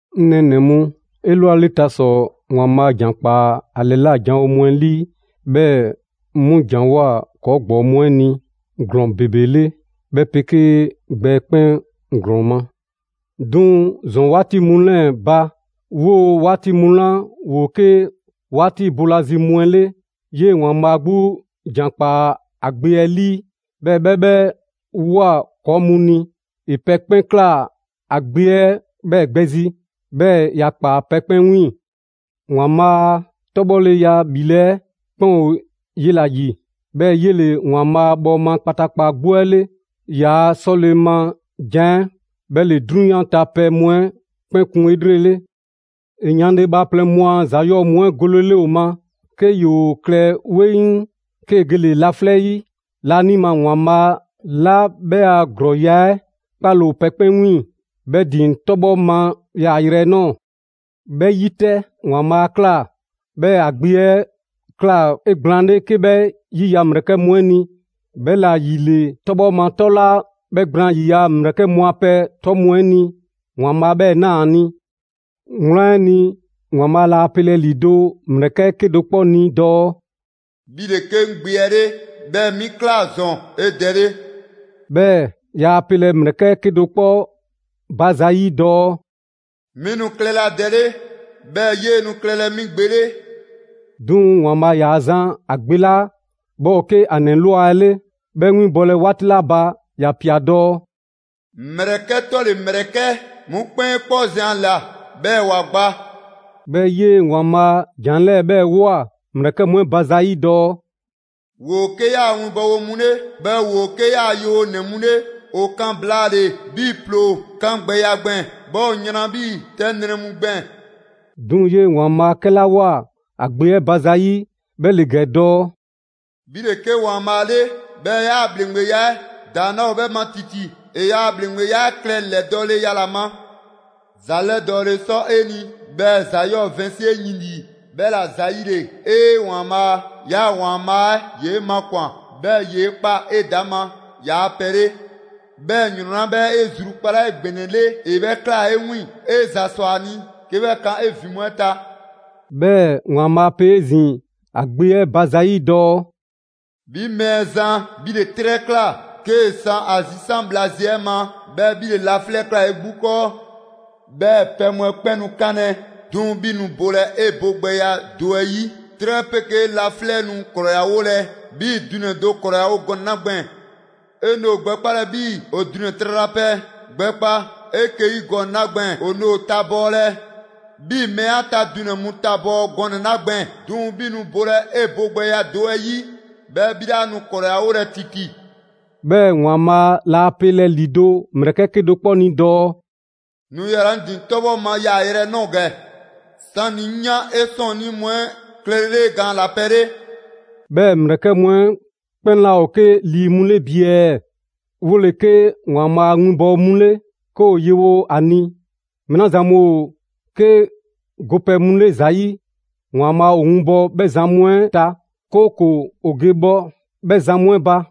'Ŋ nɛɛnɛ‑ mu, 'elwaleta ‑sɔ, ‑Waanbhaa' ‑jan ‑kpaa ‑a ‑lɛla' janwo mu 'ɛ 'lii, 'bhɛɛ‑ 'mu ‑janwoa ‑kɔɔ' ‑gbɔɔ mu 'ɛ ni ‑glɔɔn ‑bebe 'le 'bhɛ 'pegee gbɛ 'ɛ 'kpɛn ‑glɔɔn ma. 'Duŋ‑ ‑zɔn 'waati mu 'lɛɛ‑ ba, 'woo‑ 'waati mu 'la ‑woo 'ke 'waati boolazi mu 'ɛ 'le, 'yee‑ ‑Waanbhaa' 'gbu ‑jan ‑kpaa ‑a Gbe 'ɛ 'lii, 'bhɛɛ‑ 'bhɛ 'bhɛ ꞊woa ‑kɔɔ' mu ni. ‑E pɛ 'kpɛn ꞊kla ‑a Gbe 'ɛ 'bhɛɛ‑ gbɛ zi; 'bhɛɛ‑ ‑ya ‑kpaa pɛ 'kpɛn 'wiiŋ‑. ‑Waanbhaa' a 'tɔbhɔleya 'bhile 'ɛ 'kpɛn ‑o 'yela‑ ‑yi, 'bhɛɛ‑ 'yele‑ ‑Waanbhaa' bhɔɔma kpataakpa 'gbu 'ɛ 'le. ‑Yaa' 'sɔle‑ ma jan 'ɛ 'bhɛ ‑le 'drunyan ta pɛ mu 'ɛ 'kpɛn kun 'elrele. ‑E yanle bhaaplɛŋ mu a ‑za 'yɔɔ‑ mu 'ɛ golele ‑o ma, 'ke ‑yoo klɛ 'weŋ, 'kee‑ gele‑ yaalɛ laflɛ' 'yi laanima ‑Waanbhaa' 'la 'bhɛ a ‑glɔɔya' 'ɛ 'kpaale‑ ‑o pɛ 'kpɛn 'wiiŋ‑, 'bhɛ ‑din 'tɔbhɔ ma yaayrɛ 'ɛ ꞊nɔɔ. 'Bhɛ 'yi 'tɛ, ‑Waanbhaa' 'a ꞊kla 'bhɛɛ‑ ‑a Gbe 'ɛ ꞊kla 'egblaanle 'ke 'bhɛ ‑yiya' ‑mlɛkɛ' mu 'ɛ ni, 'bhɛla‑ ‑yile 'tɔbhɔ ma 'tɔ 'la 'bhɛ gblaan ‑yiya' ‑mlɛkɛ' mu a pɛ 'tɔ mu 'ɛ ni, ‑Waanbhaa' 'bhɛɛ‑ ꞊naa ‑a ni. Wlan 'ɛ ni, ‑Waanbhaa' laa pelɛ ‑lido' ‑mlɛkɛ' 'kedo‑ 'kpɔ ni dɔɔ: «'Bhi ‑le 'ke 'ŋ Gbe 'ɛ 'le, 'bhɛɛ‑ 'mi ꞊kla ‑zɔn 'e Dɛ 'le.» 'Bhɛɛ‑ yaa pelɛ ‑mlɛkɛ' 'kedo‑ 'kpɔ ba za 'yi dɔɔ: «'Mi nu klɛlɛ ‑a Dɛ 'le, 'Bhɛɛ‑ 'yee‑ nu klɛlɛ 'mi Gbe 'le.» 'Duŋ‑ ‑Waanbhaa' ‑yaa zan ‑a Gbe 'la 'bhɛ ‑o 'ke ‑a ‑nɛ ꞊lwa 'ɛ 'le 'bhɛ 'winbɔlɛ 'waati 'la ba, ‑ya ꞊pia dɔɔ: «‑Mlɛkɛ' 'tɔle‑ ‑mlɛkɛ' 'mu 'kpɛn 'e 'kpɔ zɛn ‑a ‑la, 'bhɛɛ‑ ‑wa gba.» 'Bhɛɛ‑ 'yee‑ ‑Waanbhaa' ‑jan 'lɛɛ‑ 'bhɛɛ‑ ꞊woa ‑mlɛkɛ' mu 'ɛ ba zayi' dɔɔ: «‑Woo 'ke ‑yaa' winbɔwo mu 'le, 'bhɛɛ‑ ‑woo 'ke ‑yaa' yewonɛ mu 'le, ‑o kan blaale‑ 'bhii‑ ‑ploo 'kangbɛya gbɛɛn‑, 'bhɛɛ‑ ‑o yran 'bhii‑ 'tɛ nrɛ mu gbɛɛn‑.» 'Duŋ‑ 'yee‑ ‑Waanbhaa' 'kɛla ꞊woa ‑a Gbe 'ɛ ba zayi', 'bhɛ ‑le ‑gɛ dɔɔ: «'Bhi ‑le 'ke ‑Waanbhaa' 'le, 'bhɛɛ‑ 'yaa‑ ‑bhleŋgbeya 'ɛ ‑daŋ' 'laa ‑o 'bhɛ ma ‑titi. 'E 'yaa‑ ‑bhleŋgbeya 'ɛ klɛ ‑lɛdɔɔleya ‑la ma. ‑Za 'lɛdɔɔle ‑le sɔ 'e ni, 'bhɛɛ‑ ‑za 'yɔɔ‑ vɛnsi 'e yin 'lii. 'Bhɛla‑ ‑zayile, 'ee! ‑Waanbhaa', 'yaa‑ ‑Waanbhaa' 'ɛ ‑yoo 'e makwan‑, 'bhɛɛ‑ ‑yee' ꞊kpaa 'edaŋma ‑yaa' pɛ 'le, 'bhɛɛ‑ ‑yrɔn 'la 'bhɛ 'e zrukpalaa 'egbɛnɛle ‑e 'bhɛ ꞊klaa 'e 'wiiŋ‑. 'E ‑za ꞊swa ‑a ni 'ke 'bhɛ kan 'e ‑vin mu 'ɛ ta.» 'Bhɛɛ‑ ‑Waanbhaa' pe 'ezin‑ ‑a Gbe 'ɛ ba za 'yi dɔɔ: «'Bhi Mɛɛzan, 'bhi ‑le 'trɛ ꞊kla 'kee‑ san ‑a zisan' bhla zi 'ɛ ma, 'bhɛɛ‑ 'bhi ‑le laflɛ' ꞊kla 'e 'gbu 'kɔɔ. 'Bhɛ pɛ mu 'ɛ 'kpɛn nu 'kanlɛ‑; 'duŋ‑ 'bhi nu bolɛ 'e bogbɛya do 'ɛ 'yi. 'Trɛ 'pegee laflɛ' nu ‑krɔyawolɛ 'bhii‑ dunɛ‑ do ‑krɔyawo gɔnɛ‑ 'la gbɛɛn‑. 'E nu ‑o gbɛkpalɛ 'bhii‑ ‑o dunɛ‑ tralapɛ 'ɛ gbɛkpa 'eke‑ 'yi gɔnɛ‑ 'la gbɛɛn‑. ‑O nu ‑o tabɔɔlɛ 'bhii‑ mɛɛ 'a ta dunɛ‑ mu tabɔɔ gɔnɛ‑ 'la gbɛɛn‑: 'Duŋ‑ 'bhi nu bolɛ 'e bogbɛya do 'ɛ 'yi, 'bhɛɛ‑ 'bhi 'laa nu ‑krɔyawolɛ ‑titi.» 'Bhɛɛ‑ ‑Waanbhaa' laa pelɛ‑ ‑lido' ‑mlɛkɛ' 'ɛ 'kedo‑ 'kpɔ ni dɔɔ: «Nu yala‑ 'ŋ ‑din 'tɔbhɔ ma yaayrɛ 'ɛ ꞊nɔɔ ‑gɛ, 'sani‑ 'ŋ yan 'e 'sɔɔnnii mu 'ɛ klɛlele 'e gaan ‑la pɛ 'le.» 'Bhɛɛ‑ ‑mlɛkɛ' mu 'ɛ 'kpɛn 'laa ‑o 'ke lii mu 'le bi ɛɛ? ‑Woo ‑le 'ke ‑Waanbhaa' a winbɔwo mu 'le, 'ke ‑o yewo ‑a ni. Mɛɛ la zan mu ‑o 'ke go pɛ mu 'le ‑za 'yi, ‑Waanbhaa' ‑o winbɔ 'bhɛ zan mu 'ɛ ta, 'kooko‑ ‑o ge bhɔ 'bhɛ zan mu 'ɛ ba.